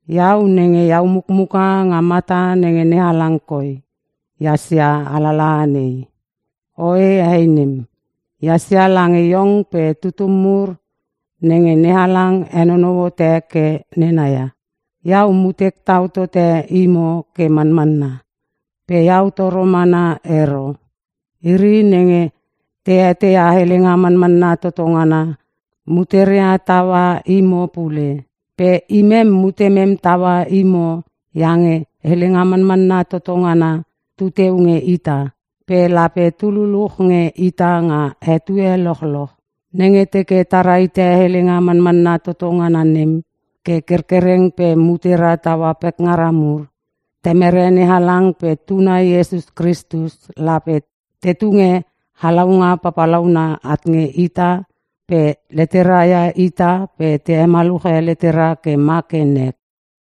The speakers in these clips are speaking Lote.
Iau nenge iau mukmuka nga mata nenge NeHalang koi ehas ia alalaha nei. Oe hei nem, ehas lange iong pe tututum mur nenge NeHalang henonou hote ke nena ia. Iau mutek tau tote imo ke manmanna. Pe iau toro mana ero. Iri nenge te eteia Helenga Manmanna Toto Ngana muteria taua imo pule. Pe imem mutemem taua imo iange Helenga Manmanna Toto Ngana tu teu nge ita, pe lape tu luluch nge ita nga etue lochloch. Nenge teke ta rahite helenga manmanna toto ngana nem ke kerkereng pe mutera taua pekngara mur, Temere NeHalang pe Tuna Iesus Kristus lape te tunge halaunga palaungana at nge ita pe leteria ia ita pe te hemaluche letera ke ma ke nek.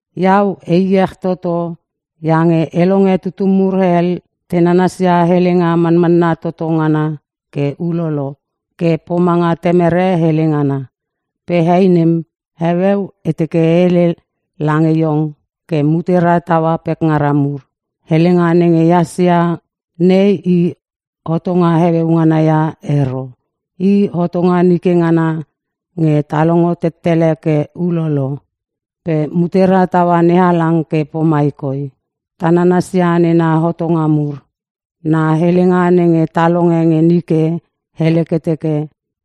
Iau e iech toto iange e longe tutum mur hel, te nanasia Helenga Manmanna Toto Ngana ke ulolo ke pomanga Temere hele ngana. Pe hei nem, heueu e teke e hele lange iong ke mutera taua pekngara mur. Helenga nenge ehas ia nei i hotonga heueu ngana ia ero. I hotonga nike ngana nenge ta longo tettele ke ulolo. Pe mutera taua NeHalang ke pomai koi: Ta nanasia nena hotonga mur. Na helenga nenge ta longe nge nike hele ke teke,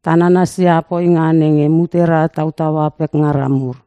ta nanasia poinga nenge mutera tautaua pekngara mur.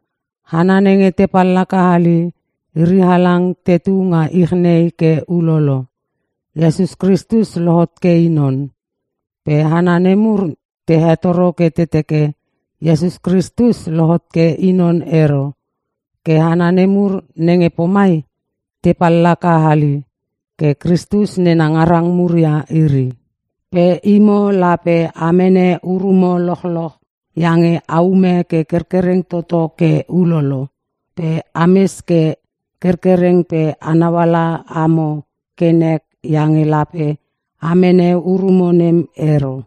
Hana nenge te pallaka hali iri halang tetu nga ich nei ke ulolo. Iesus Kristus lohot ke I non. Pe hana nemur te hetoro ke te teke Iesus Kristus lohot ke I non ero. Ke hana nemur nenge pomai, te pallaka hali pe Kristus nena ngarang mur ia iri. Pe imo lape a mene urumo lochloch iange aume ke kerkereng toto ke ulolo. Pe ames ke kerkereng pe anau ala amo ke nek iange lape a mene urumo nem ero.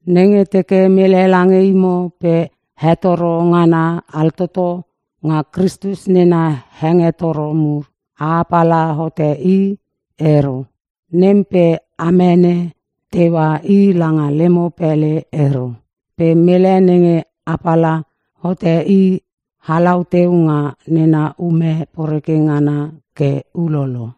Nenge teke mele lange imo pe hetoro ngana altoto nga Kristus nena hengetoro mur, a apala hote i ero. Nem pe a mene teua i langa lemo pele ero. Pe mele nenge apala hote i halau teu nga nena ume poreke ngana ke ulolo.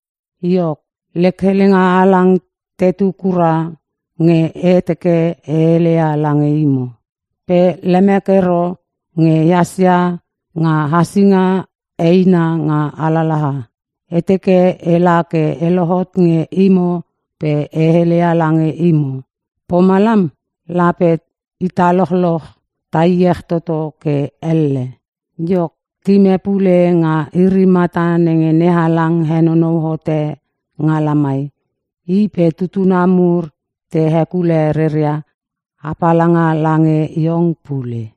Iok, lek helenga halang tetu kura nge e teke e heleia lange imo. Pe lemek ero nge ehas ia nga hasinga eina nga alalaha. E teke ela ke e lohot nge imo pe e heleia lange imo. Pomalam lape ita lochloch ta iech toto ke elle. Iok, tim e pule nga iri mata nenge NeHalang henonou hote nga lamai, i pe tutuna mur te hekule reria apalanga lange iong pule.